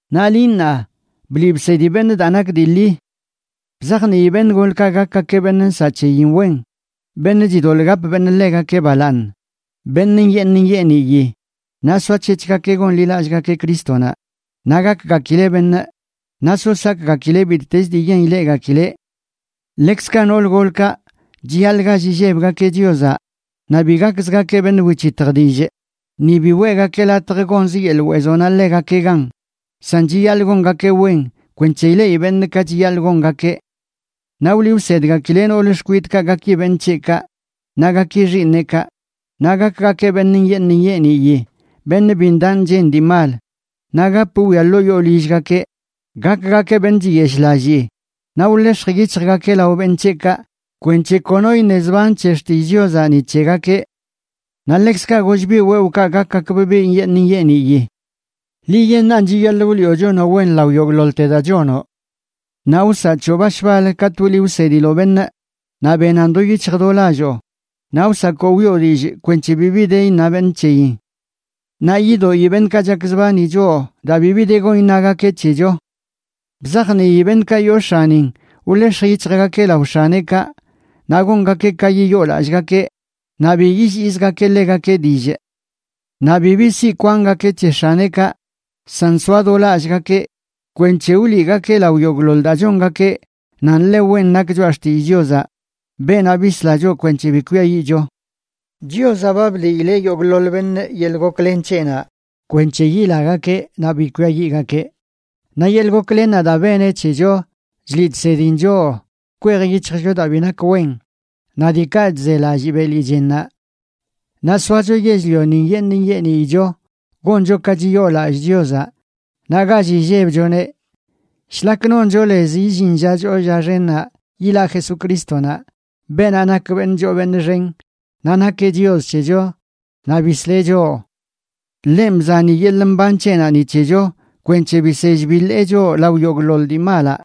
Naꞌ liꞌ ṉaa, bliꞌ bsedi beṉꞌ daa nak dii ḻi. Bzajnii beṉꞌ golkaꞌ gakgakeꞌ beṉꞌ nsaꞌ c̱heyin wen, beṉꞌ chidoḻꞌ gap beṉꞌ ḻegakeꞌ balaaṉ, beṉꞌ nyeeṉ nyeeniyi, naꞌ soac̱hec̱hgakeꞌ gonḻilallꞌgakeꞌ Crístonaꞌ, naꞌ gakgakileꞌ beṉꞌ, naꞌ so sakgakileꞌ bittez dii yen ileꞌgakileꞌ. Ḻekzkaꞌ nool golkaꞌ chiyaḻꞌ gall illebgakeꞌ Chiozaꞌ, naꞌ bi gakzgakeꞌ beṉꞌ wic̱hitj dillꞌ, ni bi weꞌgakeꞌ latj gonzə yeḻꞌ weezonaꞌ ḻegakeꞌ gan, san chiyaḻꞌ gongakeꞌ wen kwenc̱he ileꞌi beṉꞌ ka chiyaḻꞌ gongakeꞌ. Naꞌ wliꞌ wsedgakileꞌ nool xkwidꞌkaꞌ gaki beṉꞌ c̱heꞌkaꞌ naꞌ gaki xiiṉeꞌkaꞌ, naꞌ gakgakeꞌ beṉꞌ nyeeṉ nyeeniyi, beṉꞌ bi ndaꞌ nchen dii mal, naꞌ gap wwia ḻoo yoo lillgakeꞌ, gakgakeꞌ beṉꞌ chiyeshꞌlallii, naꞌ wḻex̱j yic̱hjgakeꞌ lao beṉꞌ c̱heꞌkaꞌ kwenc̱he kono iṉe zban c̱he xtillꞌ Chiozaꞌ ni c̱hegakeꞌ. Naꞌ ḻekzkaꞌ goll biꞌ wewꞌkaꞌ gakgakbꞌ biꞌ nyeeṉ nyeeniyi. Liꞌyeṉꞌan chiyaḻꞌ wliꞌo chonoꞌ wen lao yogꞌḻoḻte daa chonoꞌ. Naꞌ wsaꞌ c̱hoꞌ bash bal katꞌ wliꞌ wsediloꞌ beṉꞌ naꞌ benan do yic̱hj do lalloo, naꞌ wsakoꞌ wiꞌo dillꞌ kwenc̱he bibi de iṉa beṉꞌ c̱heyin. Naꞌ yidoꞌi beṉꞌkaꞌ chakzbani choꞌ daa bibi de gon iṉagakeꞌ c̱hecho. Bzajnii beṉꞌkaꞌ yoo x̱anin wḻex̱j yic̱hjgakeꞌ lao x̱aneꞌkaꞌ, naꞌ gongakeꞌ ka yiyoolallꞌgakeꞌ, naꞌ bi yilliizgakeꞌ ḻegakeꞌ dillꞌ. Naꞌ bibi siꞌ kwangakeꞌ c̱he x̱aneꞌkaꞌ, san soa do lallꞌgakeꞌ kwenc̱he wliꞌgakeꞌ lao yogꞌḻoḻ daa chongakeꞌ nan ḻe wen nak choꞌa xtillꞌ Chiozaꞌ, beenaꞌ bisla choꞌ kwenc̱he bi kwiayiꞌcho. Chiozaꞌ ba bliileꞌ yogꞌḻoḻ beṉꞌ yeḻꞌ goklen c̱heꞌnaꞌ kwenc̱he yilagakeꞌ naꞌ bi kwiayiꞌgakeꞌ. Naꞌ yeḻꞌ goklennaꞌ daa beneꞌ c̱hecho chliꞌ chsedin choꞌ kwej yic̱hjcho daa bi nak wen naꞌ diikaꞌ chzelallꞌ beli chennaꞌ, naꞌ soacho yell-lioni nyeeṉ nyeeniyicho, goncho ka chiyoolallꞌ Chiozaꞌ, naꞌ gall illebchoneꞌ, shlak noncho lez illin lla choo lla xennaꞌ yilaꞌ Jesucrístonaꞌ, beenaꞌ nak beṉꞌ choo beṉꞌ xen, naꞌ nakeꞌ Chios c̱hecho naꞌ bisleꞌ cho. Ḻenꞌ bzani yeḻꞌ mban c̱heꞌnaꞌ ni c̱hecho kwenc̱he bisell biḻee choꞌ lao yogꞌḻoḻ dii malaꞌ,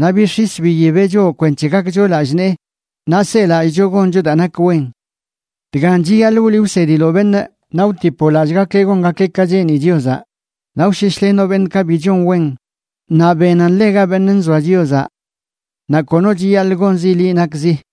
naꞌ bix̱is biyibeꞌ choꞌ kwenc̱he gakcho lallꞌ nee naꞌ selallꞌcho goncho daa nak wen. Dgan chiyaḻꞌ wliꞌ wsediloꞌ beṉꞌ, naꞌ wtipoꞌ lallꞌgakeꞌ gongakeꞌ ka cheeni Chiozaꞌ, naꞌ wsheshlenoꞌ beṉꞌkaꞌ bi chon wen, naꞌ benan ḻega beṉꞌ nzoa Chiozaꞌ. Naꞌ kono chiyaḻꞌ gonzi liꞌ nakzi.